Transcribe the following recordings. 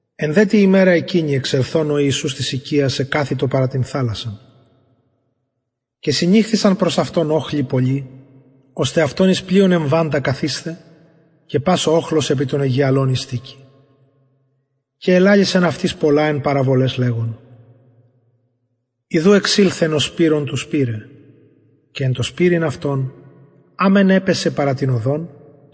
εν δε τη ημερα εκεινη εξελθων ο ιησους απο της οικιας εκαθητο παρα την θαλασσαν και συνηχθησαν προς αυτον οχλοι πολλοι ωστε αυτον εις το πλοιον εμβαντα καθησθαι και πας ο οχλος επι τον αιγιαλον ειστηκει και ελαλησεν αυτοις πολλα εν παραβολαις λεγων ιδου εξηλθεν ο σπειρων του σπειρειν και εν τω σπειρειν αυτον α μεν επεσεν παρα την οδον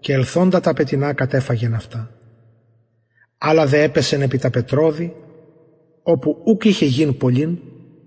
και ηλθεν τα πετεινα και κατεφαγεν αυτα αλλα δε επεσεν επι τα πετρωδη οπου ουκ ειχεν γην πολλην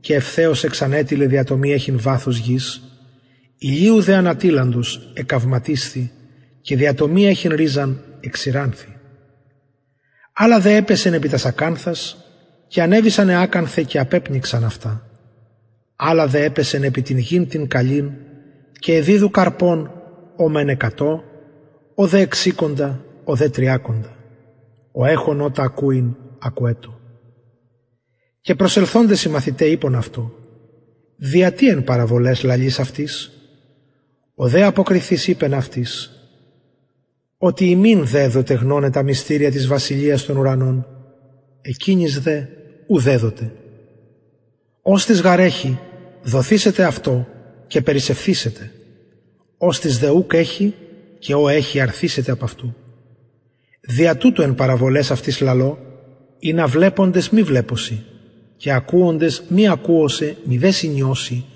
και ευθεως εξανετειλεν δια το μη εχειν βαθος γης ηλιου δε ανατειλαντος εκαυματισθη και δια το μη εχειν ριζαν εξηρανθη αλλα δε επεσεν επι τας ακανθας και ανεβησαν αι ακανθαι και απεπνιξαν αυτα αλλα δε επεσεν επι την γην την καλην και εδιδου καρπον ο μεν εκατον ο δε εξηκοντα ο δε τριακοντα ο εχων ωτα ακουειν ακουετω και προσελθοντες οι μαθηται ειπον αυτω δια τι εν παραβολαις λαλεις αυτοις ο δε αποκριθεις ειπεν αυτοις οτι υμιν δεδοται γνωναι τα μυστηρια της βασιλειας των ουρανων εκεινοις δε ου δεδοται οστις γαρ εχει δοθησεται αυτω και περισσευθησεται οστις δε ουκ εχει και ο εχει αρθησεται απ αυτου δια τουτο εν παραβολαις αυτοις λαλω οτι βλεποντες ου βλεπουσιν και ακουοντες ουκ ακουουσιν ουδε συνιουσιν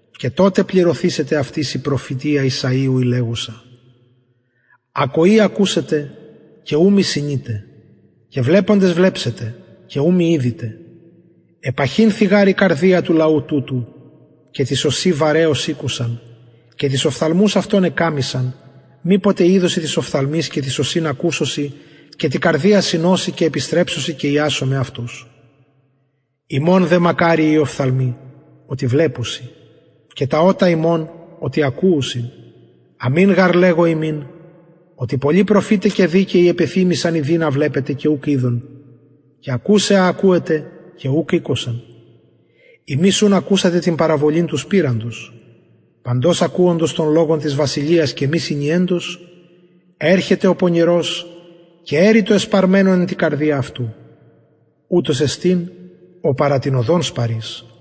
και αναπληρουται αυτοις η προφητεια ησαιου η λεγουσα ακοη ακουσετε και ου μη συνητε και βλεποντες βλεψετε και ου μη ιδητε επαχυνθη γαρ η καρδια του λαου τουτου και τοις ωσιν βαρεως ηκουσαν και τους οφθαλμους αυτων εκαμμυσαν μηποτε ιδωσιν τοις οφθαλμοις και τοις ωσιν ακουσωσιν και τη καρδια συνωσιν και επιστρεψωσιν και ιασομαι αυτους υμων δε μακαριοι οι οφθαλμοι οτι βλεπουσιν και τα ωτα υμων οτι ακουει αμην γαρ λεγω υμιν οτι πολλοι προφηται και δικαιοι επεθυμησαν ιδειν α βλεπετε και ουκ ειδον και ακουσαι α ακουετε και ουκ ηκουσαν υμεις ουν ακουσατε την παραβολην του σπειροντος παντος ακουοντος τον λογον της βασιλειας και μη συνιεντος ερχεται ο πονηρος και αρπαζει το εσπαρμενον εν τη καρδια αυτου ουτος εστιν ο παρα την οδον σπαρεις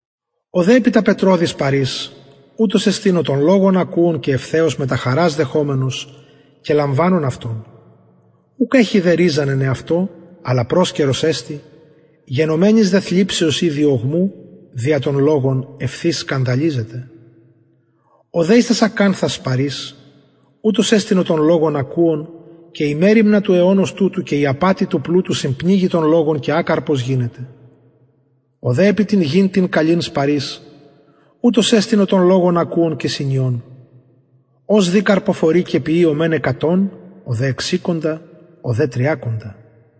ο δε επι τα πετρωδη σπαρεις ουτος εστιν ο τον λογον ακουων και ευθυς μετα χαρας λαμβανων αυτον ουκ εχει δε ριζαν εν εαυτω αλλα προσκαιρος εστιν γενομενης δε θλιψεως η διωγμου δια τον λογον ευθυς σκανδαλιζεται ο δε εις τας ακανθας σπαρεις ουτος εστιν ο τον λογον ακουων και η μεριμνα του αιωνος τουτου και η απατη του πλουτου συμπνιγει τον λογον και ακαρπος γινεται ο δε επι την γην την καλην σπαρεις ουτος εστιν ο τον λογον ακουων και συνιων ος δη καρποφορει και ποιει ο μεν εκατον ο δε εξηκοντα ο δε τριακοντα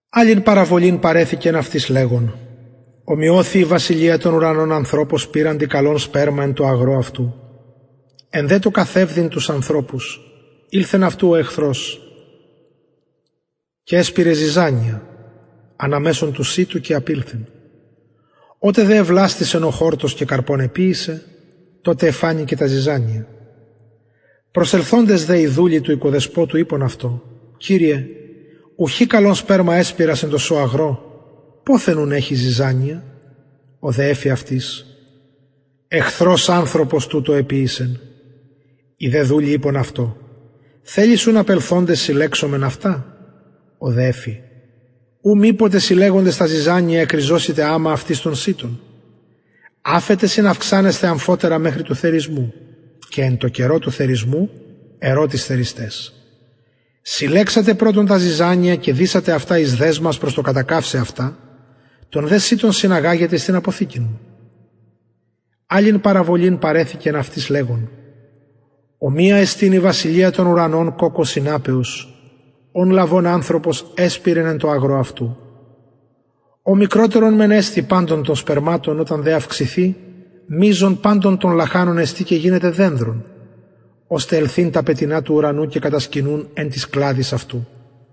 αλλην παραβολην παρεθηκεν αυτοις λεγων ωμοιωθη η βασιλεια των ουρανων ανθρωπω σπειροντι καλον σπερμα εν τω αγρω αυτου εν δε τω καθευδειν τους ανθρωπους ηλθεν αυτου ο εχθρος και εσπειρεν ζιζανια ανα μεσον του σιτου και απηλθεν οτε δε εβλαστησεν ο χορτος και καρπον εποιησεν τοτε εφανη και τα ζιζανια προσελθοντες δε οι δουλοι του οικοδεσποτου ειπον αυτω κυριε ουχι καλον σπερμα εσπειρας εν τω σω αγρω ποθεν ουν εχει ζιζανια ο δε εφη αυτοις εχθρος ανθρωπος τουτο εποιησεν οι δε δουλοι ειπον αυτω θελεις ουν απελθοντες συλλεξομεν αυτα ο δε εφη ου μηποτε συλλεγοντες τα ζιζανια εκριζωσητε αμα αυτοις τον σιτον αφετε συναυξανεσθαι αμφοτερα μεχρι του θερισμου και εν καιρω του θερισμου ερω τοις θερισταις συλλεξατε πρωτον τα ζιζανια και δησατε αυτα εις δεσμας προς το κατακαυσαι αυτα τον δε σιτον συναγαγετε εις την αποθηκην μου αλλην παραβολην παρεθηκεν αυτοις λεγων ομοια εστιν η βασιλεια των ουρανων κοκκω σιναπεως ον λαβων ανθρωπος εσπειρεν εν τω αγρω αυτου ο μικροτερον μεν εστιν παντων των σπερματων οταν δε αυξηθη μειζον των λαχανων εστιν και γινεται δενδρον ωστε ελθειν τα πετεινα του ουρανου και κατασκηνουν εν τοις κλαδοις αυτου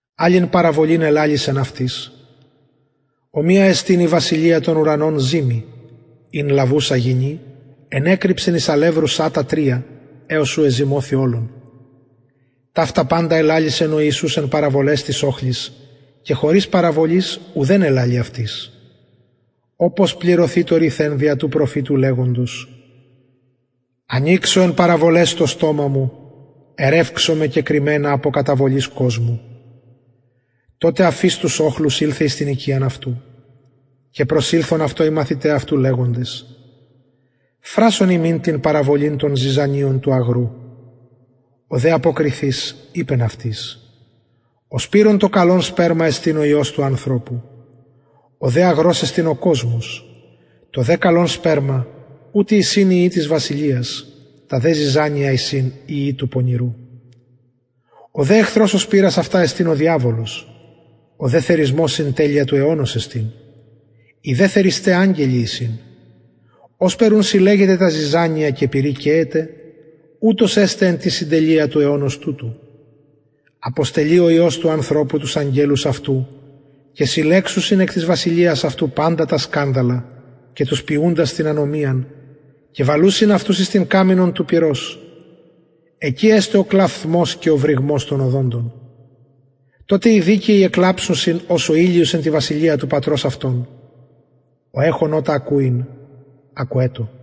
αλλην παραβολην ελαλησεν αυτοις ομοια εστιν η βασιλεια των ουρανων ζυμη ην λαβουσα γυνη εκρυψεν εις αλευρου σατα τρια εως ου εζυμωθη ολον ταυτα παντα ελαλησεν ο ιησους εν παραβολαις τοις οχλοις και χωρις παραβολης ουκ ελαλει αυτοις οπως πληρωθη το ρηθεν δια του προφητου λεγοντος ανοιξω εν παραβολαις το στομα μου ερευξομαι κεκρυμμενα απο καταβολης κοσμου τοτε αφεις τους οχλους ηλθεν εις την οικιαν ο ιησους και προσηλθον αυτω οι μαθηται αυτου λεγοντες φρασον ημιν την παραβολην των ζιζανιων του αγρου ο δε αποκριθεις ειπεν αυτοις ο σπειρων το καλον σπερμα εστιν ο υιος του ανθρωπου ο δε αγρος εστιν ο κοσμος το δε καλον σπερμα ουτοι εισιν οι υιοι της βασιλειας τα δε ζιζανια εισιν οι υιοι του πονηρου ο δε εχθρος ο σπειρας αυτα εστιν ο διαβολος ο δε θερισμος συντελεια του αιωνος εστιν οι δε θερισται αγγελοι εισιν ωσπερ ουν συλλεγεται τα ζιζανια και πυρι καιεται ουτως εσται εν τη συντελεια του αιωνος τουτου αποστελει ο υιος του ανθρωπου τους αγγελους αυτου και συλλεξουσιν εκ της βασιλειας αυτου παντα τα σκανδαλα και τους ποιουντας την ανομιαν και βαλουσιν αυτους εις την καμινον του πυρος εκει εσται ο κλαυθμος και ο βρυγμος των οδοντων τοτε οι δικαιοι εκλαμψουσιν ως ο ηλιος εν τη βασιλεια του πατρος αυτων ο εχων ωτα ακουειν ακουετω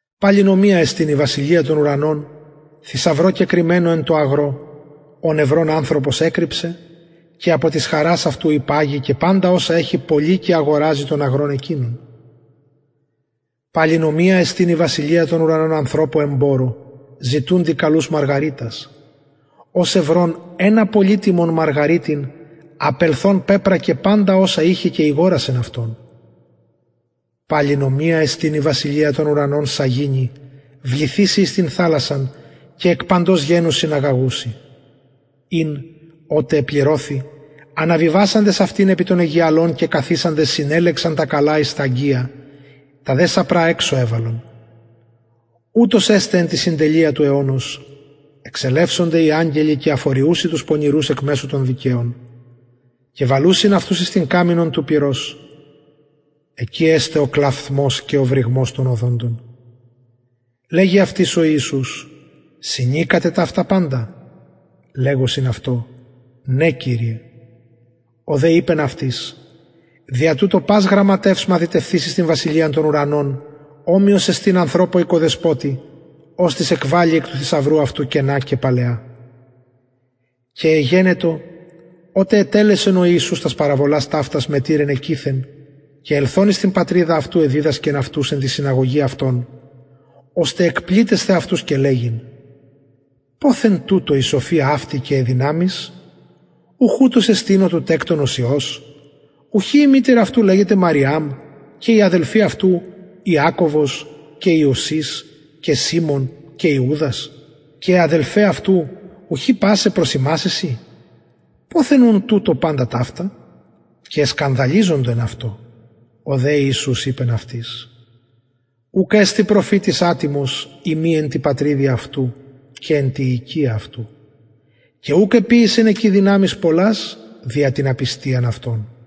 παλιν ομοια εστιν η βασιλεια των ουρανων θησαυρω κεκρυμμενω εν τω αγρω ον ευρων ανθρωπος εκρυψεν και απο της χαρας αυτου υπαγει και παντα οσα εχει πωλει και αγοραζει τον αγρον εκεινον παλιν ομοια εστιν η βασιλεια των ουρανων ανθρωπω εμπορω ζητουντι καλους μαργαριτας ος ευρων ενα πολυτιμον μαργαριτην απελθων πεπρακεν παντα οσα ειχεν και ηγορασεν αυτον παλιν ομοια εστιν η βασιλεια των ουρανων σαγηνη βληθειση εις την θαλασσαν και εκ παντος γενους συναγαγουση ην οτε επληρωθη αναβιβασαντες επι τον αιγιαλον και καθισαντες συνελεξαν τα καλα εις αγγεια τα δε σαπρα εξω εβαλον ουτως εσται εν τη συντελεια του αιωνος εξελευσονται οι αγγελοι και αφοριουσιν τους πονηρους εκ μεσου των δικαιων και βαλουσιν αυτους εις την καμινον του πυρος εκει εσται ο κλαυθμος και ο βρυγμος των οδοντων λεγει αυτοις ο ιησους συνηκατε ταυτα παντα λεγουσιν αυτω ναι κυριε ο δε ειπεν αυτοις δια τουτο πας γραμματευς μαθητευθεις εις την βασιλειαν των ουρανων ομοιος εστιν ανθρωπω οικοδεσποτη οστις εκβαλλει εκ του θησαυρου αυτου καινα και παλαια και εγενετο οτε ετελεσεν ο ιησους τας παραβολας ταυτας μετηρεν εκειθεν και ελθων εις την πατριδα αυτου εδιδασκεν αυτους εν τη συναγωγη αυτων ωστε εκπληττεσθαι αυτους και λεγειν ποθεν τουτω η σοφια αυτη και αι δυναμεις ουχ ουτος εστιν ο του τεκτονος υιος ουχι η μητηρ αυτου λεγεται μαριαμ και οι αδελφοι αυτου ιακωβος και ιωσης και σιμων και ιουδας και αι αδελφαι αυτου ουχι πασαι προς ημας εισιν ποθεν ουν τουτω ταυτα παντα και εσκανδαλιζοντο εν αυτω ο δε ιησους ειπεν αυτοις ουκ εστιν προφητης ατιμος ει μη εν τη πατριδι αυτου και εν τη οικια αυτου και ουκ εποιησεν εκει δυναμεις πολλας δια την απιστιαν αυτων